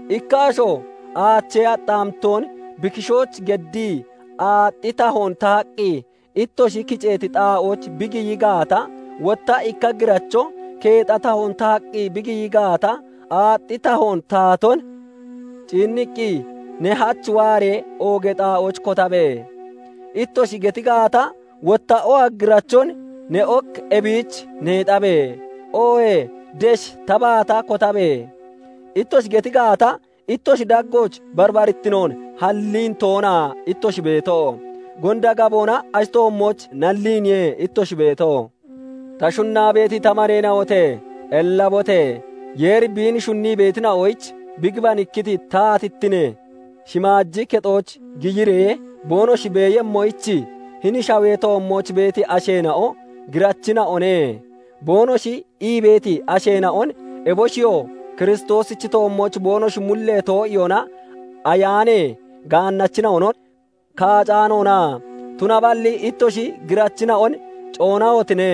Ikka asho aachee axxaamittoon bi kishooch geddii, aaxxi tahoon tahaqqi ittoshi kiceeti xaa'ooch bi giyi gaata, wotta ikka giracho keexa tahoon tahaqqi bi giyi gaata, aaxxi tahoon tahaton ciinniqqi, "Ne hach waaree oogee xaa'ooch kotabe!" ittoshi geti gaata, wotta oha girachon "Ne ok ebiich neexabe!" oohee "Desh ta baata kotabe!" ittoshi geti gaata, ittoshi daggooch barbarittinoon halliin toona ittoshi beeto? Gonda gaboona ashi toommooch nalliiniye ittoshi beeto. Ta shunnaa beeti ta maneena'ote! Ellabote! Yeeri biin shunnii beetina'oyich bi gibanikkiti bi taatittinee shimaaji kexooch giyiree boonoshi beeyemmoyich, hini shawee toommooch beeti asheena'o "Girachina'one" boonoshi ii beeti asheena'on, eboshiyoo Kiristoosichi toommooch boonoshi mullee too'iyoona ayaanee gaannachina'on kaacaanoona? Tunaballi ittoshi girachina'on coonahotine!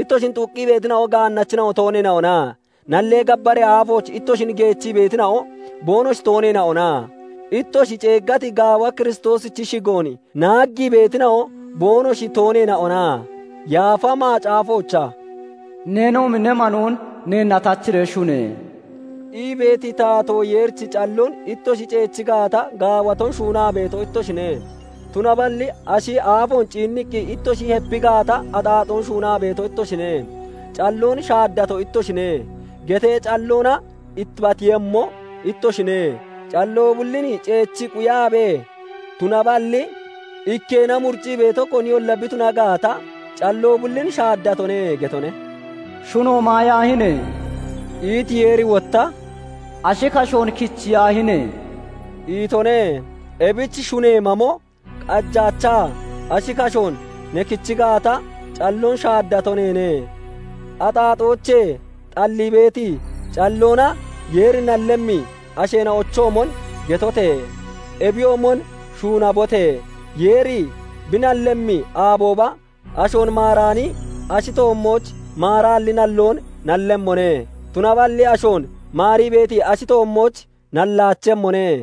Ittoshin xuqqi beetina'o gaannachina'o tooneena'ona? Nallee gabbaree aafooch ittoshin geechii beetina'o boonoshi tooneena'ona? Ittoshi ceeggati gaawa Kiristoosichi shigoon naaggii beetina'o boonoshi tooneena'ona? Yaafa Macaafoochaa "Neenoomi ne manoon neenna tachiree shune!" ii beeti Taatoo Yeerichi calloon ittoshi ceechi gaata, gaawaton shuunaa beeto ittoshine; tunaballi ashi aafoon ciinniqqi ittoshi hepi gaata, axaaxoon shuunaa beeto ittoshine; "Calloon shaaddato ittoshine" getee calloona ittibateeyemmo ittoshine. Calloo bullin ceechii quyaabee, tunaballi ikkeena muriccii beeto koniyolla bi tuna gaata, calloo bullin shaaddatone getone. "Shuno maayaahine!" iti Yeeri, wotta "Ashi kashoon kichiyaahine!" itone. Ebich shunee mamo qajaachaa, ashi kashoon ne kichi gaata, calloon shaaddato neene. Axaaxoochee xallii beeti calloona Yeeri nallemmi asheena'ochoomon getote! Ebiyoomon shuunabote! Yeeri bi nallemmi aabooba ashoon maaraani ashi toommooch maaraalli nalloon nallemmone; tunaballi ashoon maarii beeti ashi toommooch nallaachemmone.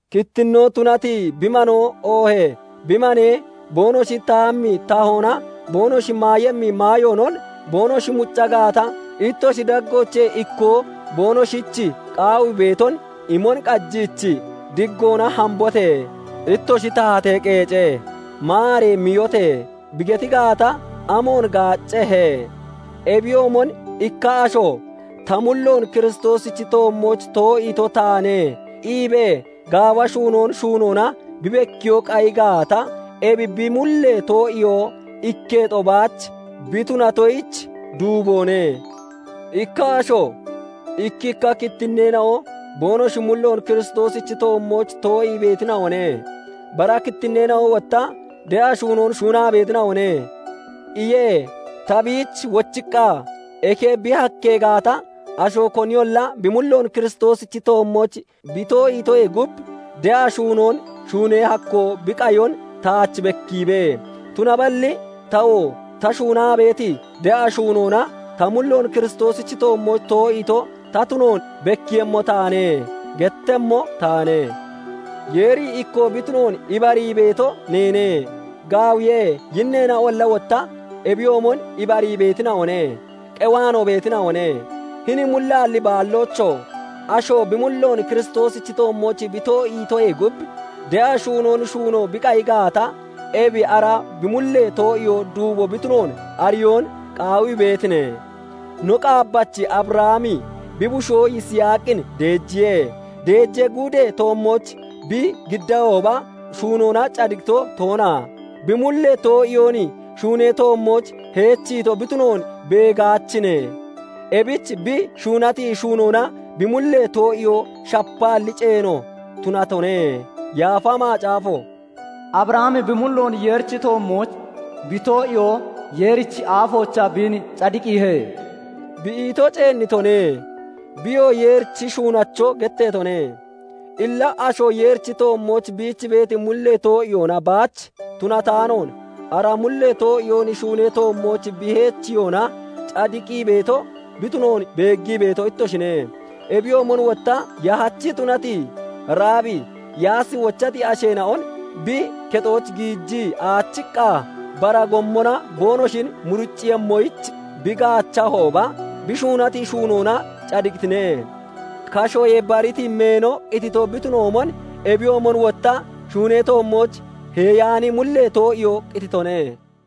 Kittinnoo tunati bi manoo, oohee bi manee boonoshi tahemmi tahoonaa boonoshi maayemmi maayoonon boonoshi mucca gaata, ittoshi daggoochee ikkoo boonoshich qaawii beeton imon qajiichii, "Diggoona hambote! Ittoshi tahatee qeece! Maaree miyote!" bi geti gaata, amoon gaaccehe? Ebiyoomon ikka asho "Ta mulloon Kiristoosichi toommooch too'iito taane" iibee gaawa shuunoon shuunoona bi bekkiyoo qayi gaata, ebi bi mullee too'iyoo ikketo baach bi tunatoyich duuboone. Ikka asho I"kkikka kittinneena'o boonoshi mulloon Kiristoosichi toommooch too'ii beetina'one; bara kittinneena'o wotta de'a shuunoon shuunaa beetina'one" iye. Ta biich wochiqqa, "Eke bi hakkee gaata, asho koniyolla bi mulloon Kiristoosichi toommooch bi too'iitoyee gub de'a shuunoon shuunee hakkoo bi qayon taach bekkiibe! Tunaballi tawoo ta shuunaa beeti de'a shuunoona ta mulloon Kiristoosichi toommooch to'iito ta tunoon bekkiiyemmo taane" gettemmo taane. Yeeri ikkoo bi tunoon ibarii beeto neene; gaawiye; yinneena'olla wotta ebiyoomon ibarii beetina'one; qewaanoo beetina'one. Hini mullaalli baalloocho! Asho bi mulloon Kiristoosichi toommooch bi too'iitoyee gub de'a shuunoon shuuno bi qayi gaata, ebi ara bi mullee too'iyoo duubo bi tunoon ariyoon qaawii beetine? No qaabbachi Abrahami bi bushoo Yisaaqin deejiya deejee gudee toommooch bi giddiihooba, shuunoona cadiqito toona? Bi mullee too'iyoon shuunee toommooch heechiito bi tunoon beegaachine? Ebich bi shuunati shuunoona bi mullee too'iyoo shapaalli ceeno tunatone. Yaafa Macaafo "Abrahami bi mulloon Yeerichi toommooch bi too'iyoo Yeerichi aafoochaa biin cadiqiihe" bi ito ceennitone; biyoo Yeerichi shunnacho getteetone. Illa asho Yeerichi toommooch biich beeti mullee too'iyoona baach tunataanoon, ara mullee too'iyoon shuunee toommooch bi heechiyoona cadiqii beeto bi tunoon beeggii beeto ittoshine. Ebiyoomon wotta yahachi tunati Raabi Yaasi wochati asheena'on bi kexooch giijii aachiqqa, bara gommona boonoshi muriccemmoyich bi gaachahooba, bi shuunati shuunoona cadiqitine. Kashoyee bariti meeno qitito bi tunoomon, ebiyoomon wotta shuunee toommooch heeyaani mullee too'iyoo qititone.